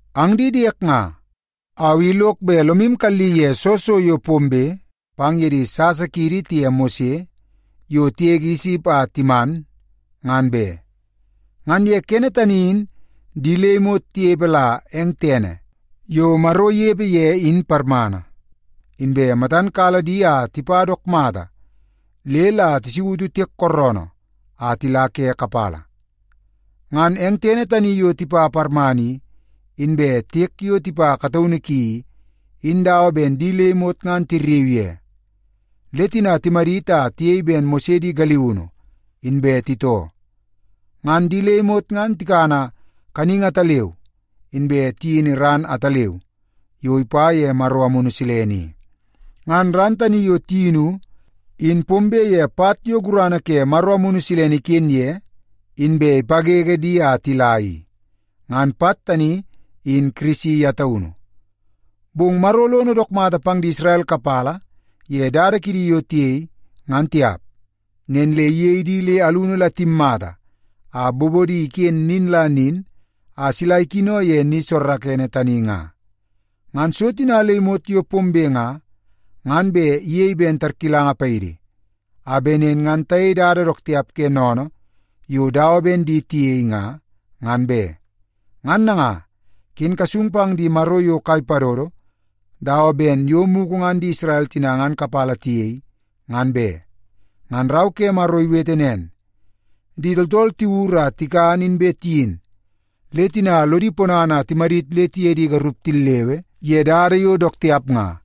Ang di diek nga, au i lok bet lomu kalli ye soo so yo pombe pang ye di sasa kiidi tiye Mose yo tigege Isip a timan, ngan be. Ngan ye kene tani in di le imot tinepe la eng tene yo Maro inepe ye in parmana, inbe matan kala di a tipa dook mata le la tisautu Tiek Kooroonoo a tila ke kapala. Ngan eng tene tani yo tipa parmana i, inbe tiek yo tipa kataunu ki i, in dawa ben di le imot ngan tirriu ye oo. Le tina timadit a tiyei ben Mose di galiunu inbe titoo. Ngan di le imot ngan tikana kaningi ataleu inbe tiyini ran ataleu yo ipa ye Maro Amunu Silene i. Ngan ran tani yo tiyinu in pombe ye pat yo gurana ke Maro Amunu Silene iken ye inbe ipawewe di a tila i. Ngan pat tani in Kirisi ye taunu. Bong Maro lono dook mata pang di Isrel kapala ye dada kidi yo tiyei, ngan tiap. Nen le iyei di le alunu la timmata a bobodi iken nin la nin a sila ikino ye ni soorookoonoo tani nga. Ngan so tina le imot yo pombe nga, ngan bet iyei ben tarkilanga paidi, a bet nen ngan tayei dada dook tiap ke sennene yo dawa ben di tiyei nga, ngan be. Ngan nanga, ken kasung pang di maro yo kai padodo nga dawa ben yo mugu ngan di Isrel tina ngan kapala tiyei, ngan be. Ngan Rau ke Maro iwete nen, “Di tooltool tiwur a tikan inbe tiyin, le tina lodi ponana a timadit le tiye di garup tillewe ye dada yo dook tiap nga.”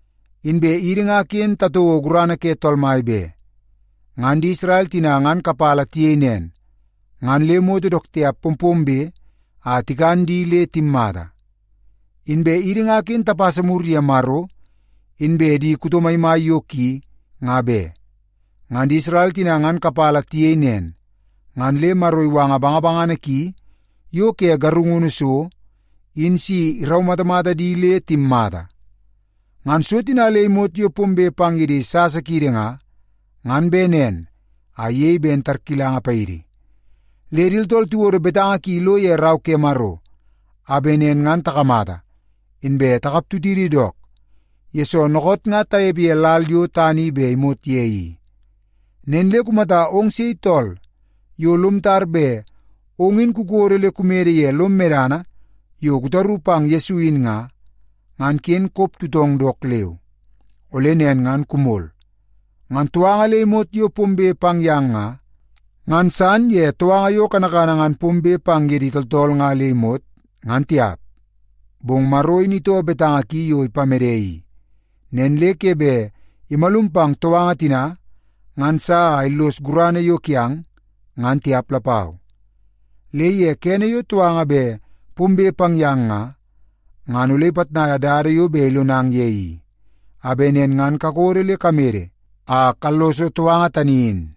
Inbe idi nga ken tatouo gurana ke Tool Mai be. Ngan di Isrel tina ngan kapala tiyei nen, ngan le moto dook tiap pompombe a tikan di le timmata. Inbe idi nga ken tapasa mur ye Maro inbe di kuto maimai yo ki, nga be. Ngan di Isrel tina ngan kapala tiyei nen, ngan le Maro iwanga bangabangana ki yo ke garungunu so in si iraumatamata di le timmata. Ngan so tina le imot yo pombe pang ye di sasa kiidi nga, ngan bet nen a iyei ben tarkilanga paidi. Le di tooltool tiwodo betanga ki ilo ye Rau ke Maro a bet nen ngan takamata, inbe takap tutidi dook, yesoo dookoot nga tanepe ye lal yo tana i bet imot ye i. Nen le kumata ong sei tooltool yo lom tar bet ong in kukodo le kumede ye lom medana yo kutaru pang Yesu in nga, ngan ken kop tutong dook leu. Ole nen ngan kumol. Ngan touanga le imot yo pombe pang yang nga, ngan san ye touanga yo kanakana ngan pombe pang ye di tooltool nga le imot ngan tiap. Bong Maro in itoo betanga ki yo ipamede i, nen le ke bet imalum pang touanga tina ngan sa a illos gurana yo kiang, ngan tiap lapau. Le ye kene yo touanga bet pombe pang yang nga, ngan ole ipitnaia dada yo bet ilonang ye i, a bet nen ngan kakodo le kamede a kalloso touanga tani in.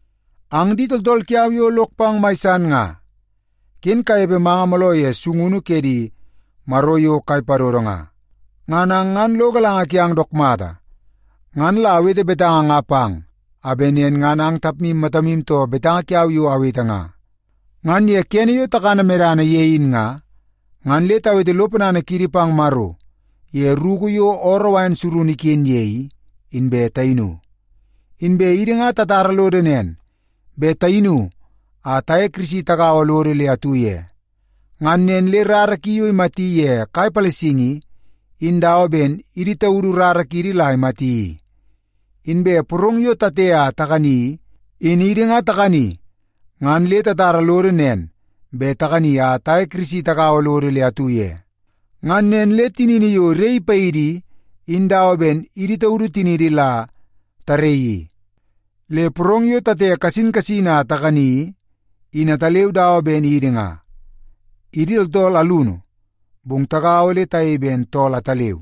Ang di tooltool kiau yo lok pang mai san nga, ken kanepe manga mooloo ye sungunu ke di maro yo kai padodo nga. Ngan ang ngan lo galanga kiang dook mata. Ngan la awete betanga nga pang a bet nen ngan ang tapmu matamu too betanga kiau yo awete nga. Ngan ye kene yo takana medana ye in nga, ngan le tawete lo ponana kiidi pang Maro ye ruku yo ooroo wain surunu iken ye i, inbe tayinu. Inbe idi ngan tatara lodo nen bet tayinu a taye Kirisi tagaua lodo le atu ye. Ngan nen le rara ki yo imati ye kai palasingi i, in dawa ben idi taudu rara kiidi la imati i. Inbe porong yo tate a takani i, in idi nga takani ngan le tatara lodo nen bet takani a taye Kirisi tagaua lodo le atu ye. Ngan nen le tinini yo iraii paidi i, in dawa ben idi taudu tiniidi la taraii i. Le porong yo tate kasin kasin a takani i, in ataleu dawa ben idi nga. Idi tooltool alunu, bong tagaua le tayei ben tool ataleu,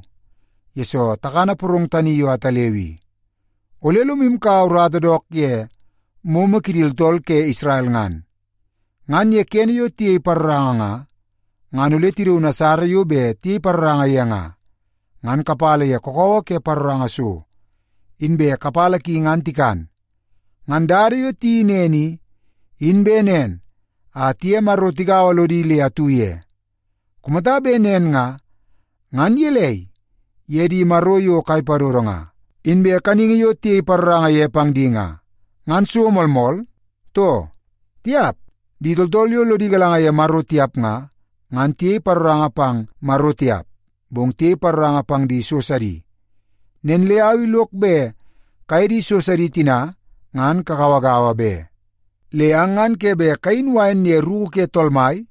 yesoo takana porong tani yo ataleu i. Ole lomu kaua urata dook ye momo kidi tooltool ke Isrel ngan. Ngan ye kene yo tiyei paroranga nga, ngan ole tidaun asara yo bet tiyei paroranga ye nga, ngan kapala ye kakawa ke paroranga so, inbe kapala ki ngan tikan. Ngan dada yo tiyeii nen i, in bet nen a tiye Maro tigaua lodi le atu ye. Kumata bet nen nga, ngan gelei ye di maro yo kai padodo nga, inbe kaningi yo tiyei paroranga ye pang di nga? Ngan so moolmool, too? Tiap! Di tooltool yo lodi galanga ye Maro tiap nga, ngan tiyei paroranga pang Maro tiap, bong tiyei paroranga pang di so sidi. Nen le au i lok bet kaye di so sidi tina ngan kagauagaua be. Le ang ngan ke bet kayin wain ye ruku ke Tool Mai,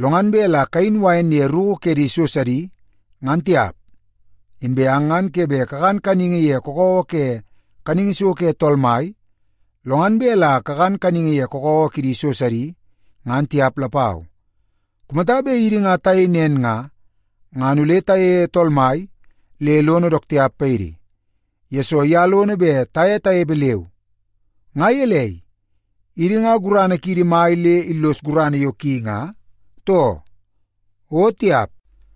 lo ngan bet la kayin wain ye ruku ke di so sidi, ngan tiap. Inbe ang ngan ke bet kakan kaningi ye kakawa ke kaningi so ke Tool Mai, lo ngan bet la kakan kaningi ye kakawa kidi so sidi, ngan tiap lapau. Kumata bet idi nga tayei nen nga, ngan ole tayeie Tool Mai le lono dook tiap paidi, yesoo ye lono bet taye tanepe leu. Nga gelei, idi nga gurana kiidi mai le illos gurana yo ki nga, too? O tiap!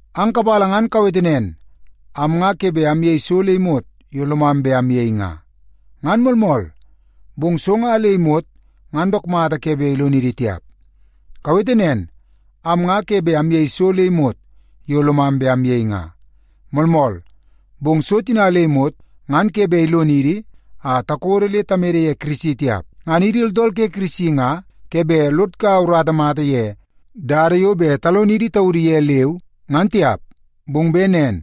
Ang kapala ngan kawete nen, “Am nga ke bet amyei so le imot yo lomam bet amyei nga.” Ngan moolmool, bong so nga le imot ngan dook mata ke bet ilonidi tiap. Kawete nen, “Am nga ke bet amyei so le imot yo lomam bet amyei nga.” Moolmool, bong so tina le imot ngan ke bet ilonidi a takodo le tamede ye Kirisi tiap. Ngan idi tooltool ke Kirisi nga ke bet lod kaua urata mata ye dada yo bet talonidi taudu ye leu ngan tiap, bong bet nen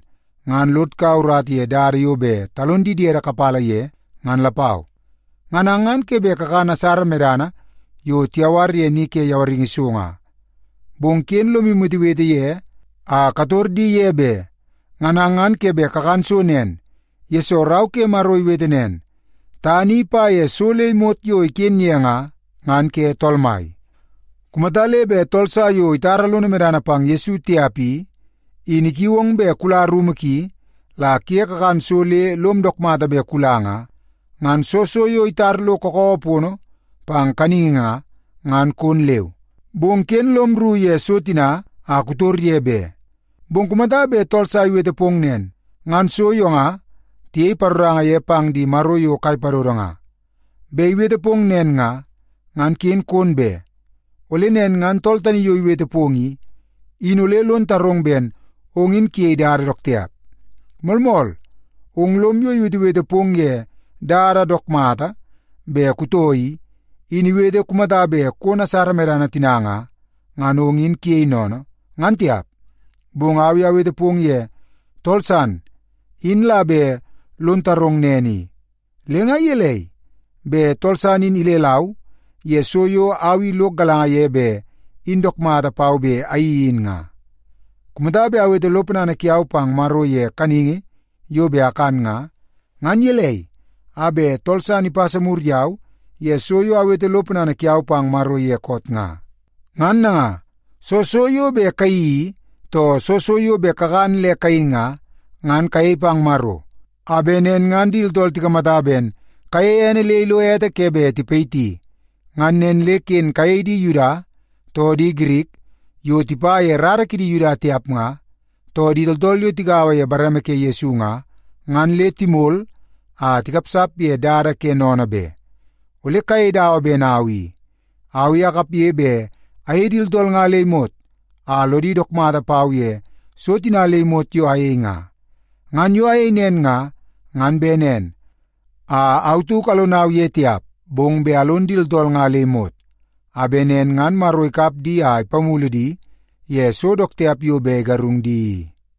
ngan lod kaua urata ye dada yo bet talon di diede kapala ye ngan lapau. Ngan ang ngan ke bet kakan asara medana yo tiyawar ye ni ke yawaringi so nga, bong ken lomu wetewete ye a kator di ye be. Ngan ang ngan ke bet kakan so nen, yesoo Rau ke Maro iwete nen, “Tana i ipa ye so le imot yo iken ye nga, ngan ke Tool Mai.” Kumata le bet tool sa yo itara lono medana pang Yesu tiap i, in ikiu ong bet kula rumu ki la kuye kakan so le lom dook mata bet kula nga, ngan soo so yo itar lo kakawa pono pang kaningi nga, ngan kon leu. Bong ken lom rru ye so tina a kutor ye be. Bong kumata bet tool sa iwete pong nen, “Ngan so yo nga tiyei paroranga ye pang di maro yo kai padodo nga,” bet iwete pong nen nga, ngan ken kon be. Ole nen ngan tool tani yo iwete pong i, in ole lon tarong ben ong in kuyei dada dook tiap. Moolmool, ong lom yo iwetewete pong ye dada dook mata bet kutoo i, in iwete kumata bet kon asara medana tina nga, ngan ong in kuyei sennene, ngan tiap. Bong au i awete pong ye tool san in la bet lon tarong nen i. Le nga gelei, bet tool san in ilelau ye so yo au i lok galanga ye bet in dook mata pau bet ayeii in nga? Kumata bet awete lo ponana kiau pang Maro ye kaningi yo bet akan nga, ngan gelei a bet tool san ipasa mur yau ye so yo awete lo ponana kiau pang Maro ye koot nga? Ngan nanga, soo so yo bet kayeii i, too soo so yo bet kakan le kayin nga, ngan kayei pang Maro, a bet nen ngan di tooltool tikamata ben kayeie ene le ilo ete ke bet tipayiti. Ngan nen le ken kayei di Yuda, too di Girik yo tipa ye rara kidi Yuda tiap nga, too di tooltool yo tigaua ye bareme ke Yesu nga, ngan le timol a tikapsap ye dada ke sennene be. Ole kayei dawa ben au. Au i akapge bet ayei di tooltool nga le imot a lodi dook mata pau ye so tina le imot yo ayei nga. Ngan yo ayei nen nga, ngan bet nen a au tauk alonau ye tiap, bong bet alon di tooltool nga le imot, a bet nen ngan Maro ikap di a ipamulu di ye so dook tiap yo bet igarungu di i.